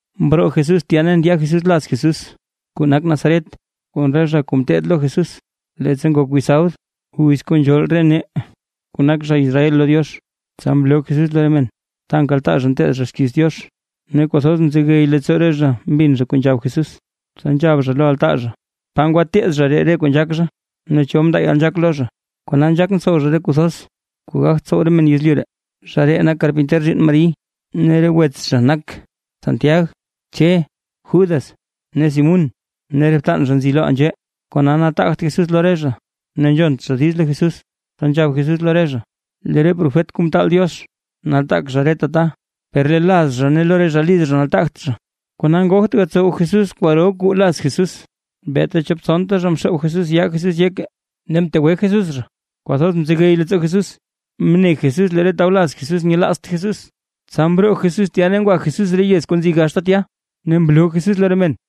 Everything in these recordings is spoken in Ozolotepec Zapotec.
Mroo Jesús tya ne ndya Jesús laz Jesús, kuu nak Nazaret, kon re zha kuu ngeteed lo Jesús. Leettsa ngok wiz sabd, wiz kuu nzhool re nee kuu nak zha Israel lo Diox, tsa mloo Jesús lo re men, ta nkaltaa zha nteed zha xkiiz Diox. Ne kwathoz mzegey leettsoo re zha mbin zha kuu nzhab Jesús, tsa nzhab zha lo altaa zha: ―¿Pa ngwateed zha ree re kuu nzhaak zha? ¿Ne cho mndaa yalnzhaak lo zha? ¡Kona nzhaak ntsow zha re kuu thoz kuu gagt tsow re men yezlyu ree! ¡Zha ree nak karpinter zhiinn Mari! ¡Ne re wets zha nak: Santiag, Che, Judas ne Simún ne re btan zha nzi loʼaa nzhee! Kona nataagt Jesús lo re zha, ne nzhont zha diiz lo Jesús. Tsa nzhab Jesús lo re zha: ―Lee re profet kuu ntaal Diox nataak zha reta ta, per lee laz zha ne lo re zha liz zha nataagt zha. Kona ngogt gatsow Jesús kwaro kwaa laz Jesús, beeta chop tsonta zha mxoob Jesús yaa Jesús yeke ne mtegwe Jesús zha. Kwathoz mzegey leettsoo Jesús, mne Jesús lee re tawlaz Jesús nyelaazt Jesús. Tsa mroo Jesús tya ne ngwa Jesús re yez kuu nzi gaxta tya, ne mloo Jesús lo re men.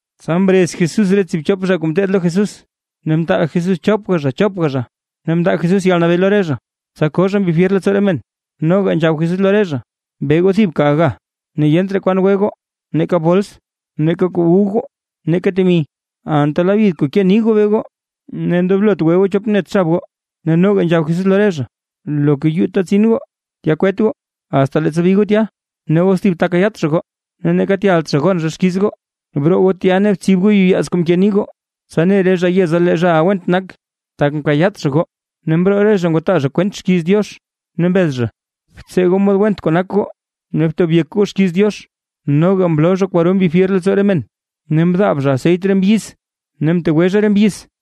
Tsa mrez Jesús re tsiibchop zha kuu ngeteed lo Jesús, ne mtaal Jesús chopga chopga zha, ne mndaa Jesús yalnabee lo re zha, tsa koo zha mbi fyer leettsoo re men. Noga nzhab Jesús lo re zha: ―Be goo thibka aga ne yent raa kwan gwe goo, neeka bols, neeka kuu wu goo ne neeka temi. Anta labyid kuu nke nii goo be goo, ne ndoblot gwe goo chop net xab goo. Ne noga nzhab Jesús lo re zha: ―Loka yuu ta tsin goo, tya kwet goo, asta leettsa bi goo tya. Ne os thib ta kayaat zha goo, ne neeka tyalt zha gon zha xkiiz goo, broo goo tya ne btsib goo yuyaaz kuu mke nii goo, tsa ne re zha yeza lee re zhaʼa went nak, tak mkayaat zha goo. Ne mroo re zha ngwataa zha kwent xkiiz Diox ne mbez zha, btsee goo mod went kuu nak goo ne btob yek goo xkiiz Diox. Noga mloo zha kwaro mbi fyer leettsoo re men, ne mndaab zha aseyt re mbyiz ne mtegwe zha re mbyiz.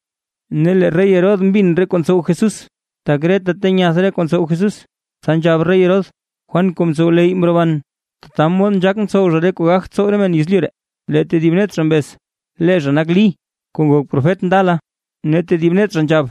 Ne lee rey Herodes mbin re kuu ntsow Jesús, tak reta ta nyath re kuu ntsow Jesús. Tsa nzhab rey Herodes: ―Juan kuu mtsowleyy mroban, tata mod nzhaak ntsow zha re kuu gagt tsow re men yezlyu ree. Lee tedib net zha mbez: ―Lee zha nak Lí kuu ngok profet ndala. Ne tedib net zha nzhab: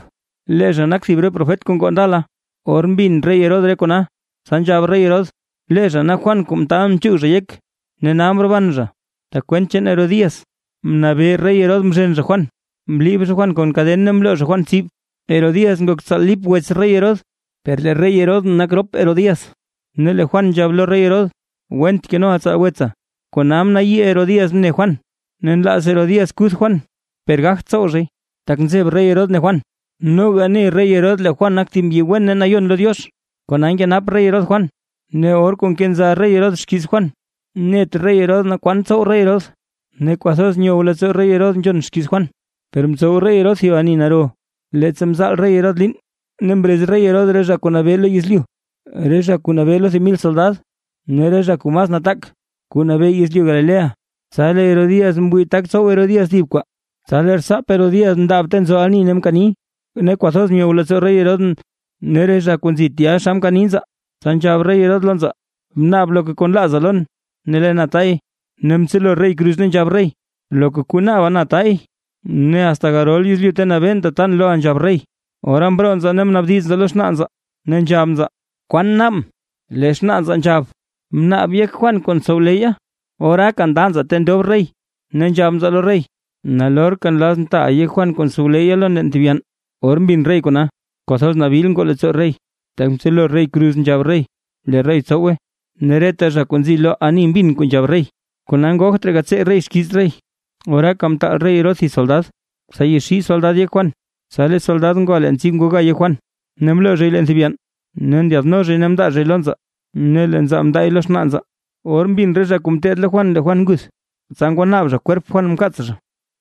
―Lee zha nak thib re profet kuu ngoo ndala. Or mbin rey Herodes re kona, tsa nzhab rey Herodes: ―¡Lee zha nak Juan kuu mtaalʼn mchuug zha yek, ne nal mroban zha! Tak kwent chaan Herodías, mnabee rey Herodes mzhen zha Juan, mliib zha Juan kon kaden ne mloo zha Juan tsib. Herodías nak tsaal Lip wets rey Herodes. Per lee rey Herodes nak rop Herodías. Ne lee Juan nzhab lo rey Herodes: ―Went kenoʼa tsaal wetsa. Kona mnayii Herodías mne Juan, ne nlaaz Herodías kuth Juan, per gagt tsow zhay. Tak nzeb rey Herodes ne Juan, noga ne rey Herodes lee Juan nak thib mbyi wen ne nayon lo Diox, kona nkenap rey Herodes Juan. Ne or kuu nkenza rey Herodes xkiiz Juan net rey Herodes naa kwan tsow rey Herodes, ne kwathoz nyow leettsoo rey Herodes nzhon xkiiz Juan. Per mtsow rey Herodes thib ani naro, leettsa mzaal rey Herodes liin, ne mrez rey Herodes re zha kuu nabee lo yezlyu, re zha kuu nabee lo thib mil soldad ne re zha kuu mas nataak kuu nabee yezlyu Galilea. Tsa lee Herodías mwii tak tsow Herodías thib kwaa. Tsa lee rtsaap Herodías mndaab ta nzo ani ne mkani, ne kwathoz myow leettsoo rey Herodes ne re zha kuu nzi tya xa mkani nzaa, tsa nzhab rey Herodes lo nzaa: ―Bnaab loka kuu nlaaza lon, ne lee na tay. Ne mtselo rey kruz ne nzhab rey: ―Loka kuu naaba na taay, ne asta garol yezlyu ta nabeen tatan loʼa nzhab rey. Ora mroo nzaa ne mnaabdiz nzaa lo xnaa nzaa, ne nzhab nzaa: ―¿Kwaan naabʼn? Lee xnaa nzaa nzhab: ―Bnaab yek Juan kuu ntsowleyya. Oraaka nda nzaa ta ndob rey, ne nzhab nzaa lo rey: ―¡Nalorka nlazʼn taaʼa yek Juan kuu ntsowleyya lon leen thib yann! Or mbin rey kona, kwathoz nabil ngoo leettsoo rey, tak mtselo rey kruz nzhab rey lee rey tsowe, ne reta zha kuu nzi lo ani mbin kuu nzhab rey, kona ngogt raa gatsee rey xkiiz rey. Oraaka mtaal rey Herodes thib soldad, tsa yaxii soldad yek Juan. Tsa lee soldad ngwa leen tsib mga yek Juan, ne mloo zhay leen thib yann, ne ndyaadno zhay ne mndaa zhay lo nzaa, ne lee nzaa mndaay lo xnaa nzaa. Or mbin re zha kuu ngeteed lo Juan lee Juan nguth, tsa ngwanaab zha kwerp Juan mkaats zha.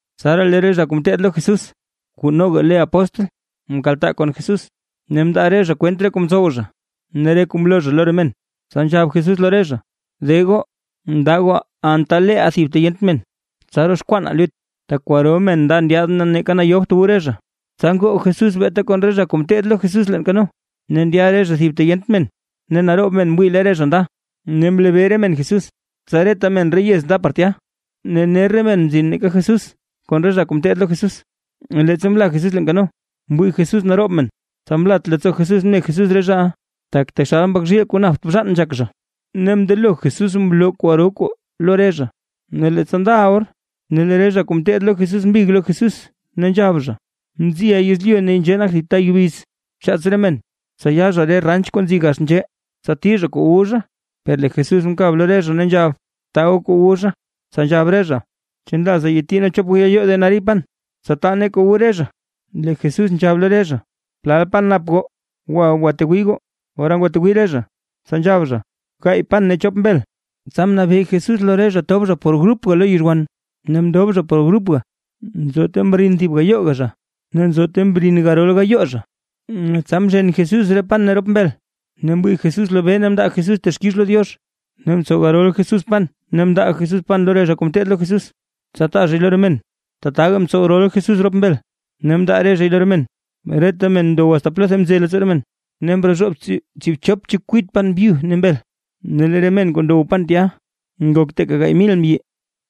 Tsaraa lee re zha kuu ngeteed lo Jesús kuu noga le apóstl, mkaltaa kon Jesús, ne mndaa re zha kwent re kuu mtsow zha ne re kuu mloo zha lo re men. Tsa nzhab Jesús lo re zha: ―De goo, nda goo anta leeʼaa thib ta yent men, tsa roxkwanaa lut. Tak kwaro men nda ndyaad ne neeka yobt wu re zha. Tsa ngoo Jesús beeta kon re zha kuu ngeteed lo Jesús leen kano, ne ndya re zha thib ta yent men. Ne naroob men mwii lee re zha nda, ne mlebee re men Jesús; tsa reta men re yez nda par tya, ne ner re mena mzin nake Jesús kon re zha kuu ngeteed lo Jesús. Leettsa mla Jesús leen kano, mwii Jesús naroob men, tsa mlat leettsoo Jesús mne Jesús re zhaʼa, tak taxal mbak zhiil kuu napt bzhaan nzhak zha, ne mndelo Jesús mloo kwaro kuu lo re zha. Ne leettsa ndaʼa or, lee re zha kuu ngeteed lo Jesús mbig lo Jesús, ne nzhab zha: ―Mziʼa yezlyu ne nzhee nak thib ta yubiz. Bchaats re men, tsa ya re zha re ranch kuu nzi gax nzhee, tsa tii zha kuu wu zha. Per lee Jesús mkab lo re zha, ne nzhab: ―Taa goo kuu wu zha. Tsa nzhab re zha: ―¿Chu nlaaza yati nee chop gayoo denario pan, tsa taa nee kuu wu re zha? Lee Jesús nzhab lo re zha: ―¿Plal pan nap goo? ¡Gwa goo gwatwii goo! Ora ngwatwii re zha, tsa nzhab zha: ―Gaay pan ne chop mbel. Tsa mnabee Jesús lo re zha tob zha por grupga lo yizhwan. Ne mndob zha por grupga, nzo ta mrin thib gayooga zha, ne nzo ta mrin garol gayoo zha. Tsa mzhen Jesús re pan ne rop mbel ne mwii Jesús lobee ne mndaa Jesús texkix lo Diox, ne mtsow rol Jesús pan ne mndaa Jesús pan lo re zha kuu ngeteed lo Jesús, tsa taa zhay lo re men, tataka mtsow rol Jesús rop mbel, ne mndaa re zhay lo re men. Reta men ndow asta plotha mze leettsoo re men. Ne mrozhoob tsiibchop chekwit pan byu ne mbel. Ne lee re men kuu ndow pan tya ngok teeka gaay mil mbyi.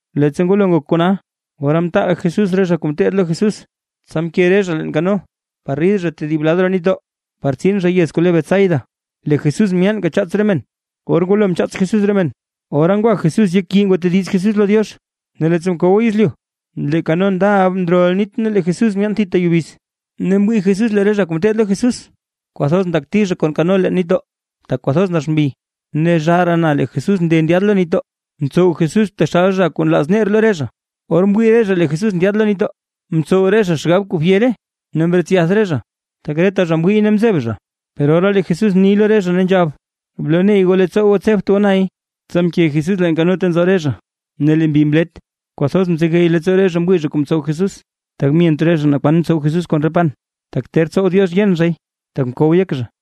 Leettsa ngwalo ngok kona, ora mtaal Jesús re zha kuu ngeteed lo Jesús, tsa mke re zha leen kano, par rid zha tedib lad roo nitdoo, par tsin zha yez kuu le Betsaida. Lee Jesús myaanka chaats re men. Or ngwalo mchaats Jesús re men, ora ngwa Jesús yek yii ngwatediz Jesús lo Diox. Ne leettsa mkow yezlyu lee kano ndaʼa ndrol nit ne lee Jesús myaan thita yubiz, ne mwii Jesús lee re zha kuu ngeteed lo Jesús, kwathoz ndakti kon kano lo nitdoo, tak kwathoz nax mbi. Ne zhaaraa na lee Jesús nde ndyaad lo nitdoo, mtsow Jesús taxal zha kuu nlaaz ner lo re zha. Or mwii re zha lee Jesús ndyaad lo nitdoo, mtsow re zha xgab, kuu fyera ne mretsyath re zha; tak reta zha mwiiy ne mzeb zha. Per ora lee Jesús mni lo re zha ne nzhab: ―¡Bloney goo leettsoo, tsebt goo nay! Tsa mke Jesús leen kano ta nzo re zha, ne lee mbi mlet; kwathoz mzegey leettsoo re zha mwii zha kuu mtsow Jesús. Tak myent re zha naa kwan mtsow Jesús kon re pan, tak ter tsow Diox yen zhay, tak mkow yek zha.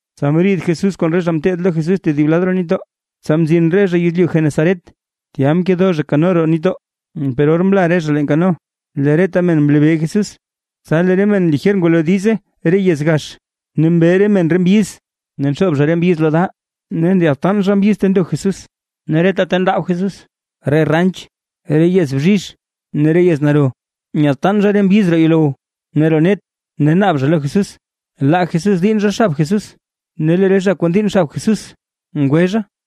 Tsa mriid Jesús kon re zha kuu ngeteed lo Jesús tedib lad roo nitdoo, tsa mzin re zha yezlyu Genesaret, tya mkedo zha kano roo nitdoo. Per or mla re zha leen kano, lee reta men mlebee Jesús. Tsa lee re men lijer ngwalo diize re yez gax, ne mbe re men re mbyiz ne nxoob zha re mbyiz lo da ne nyadtaan zha mbyiz ta ndo Jesús. Ne reta ta ndaab Jesús re ranch re yez bzhizh ne re yez naro, nyadtaan zha re mbyiz roo yuulow ne roo net ne naab zha lo Jesús, laa Jesús diinn zha xab Jesús; ne lee re zha kuu ndiinn xab Jesús ngwe zha.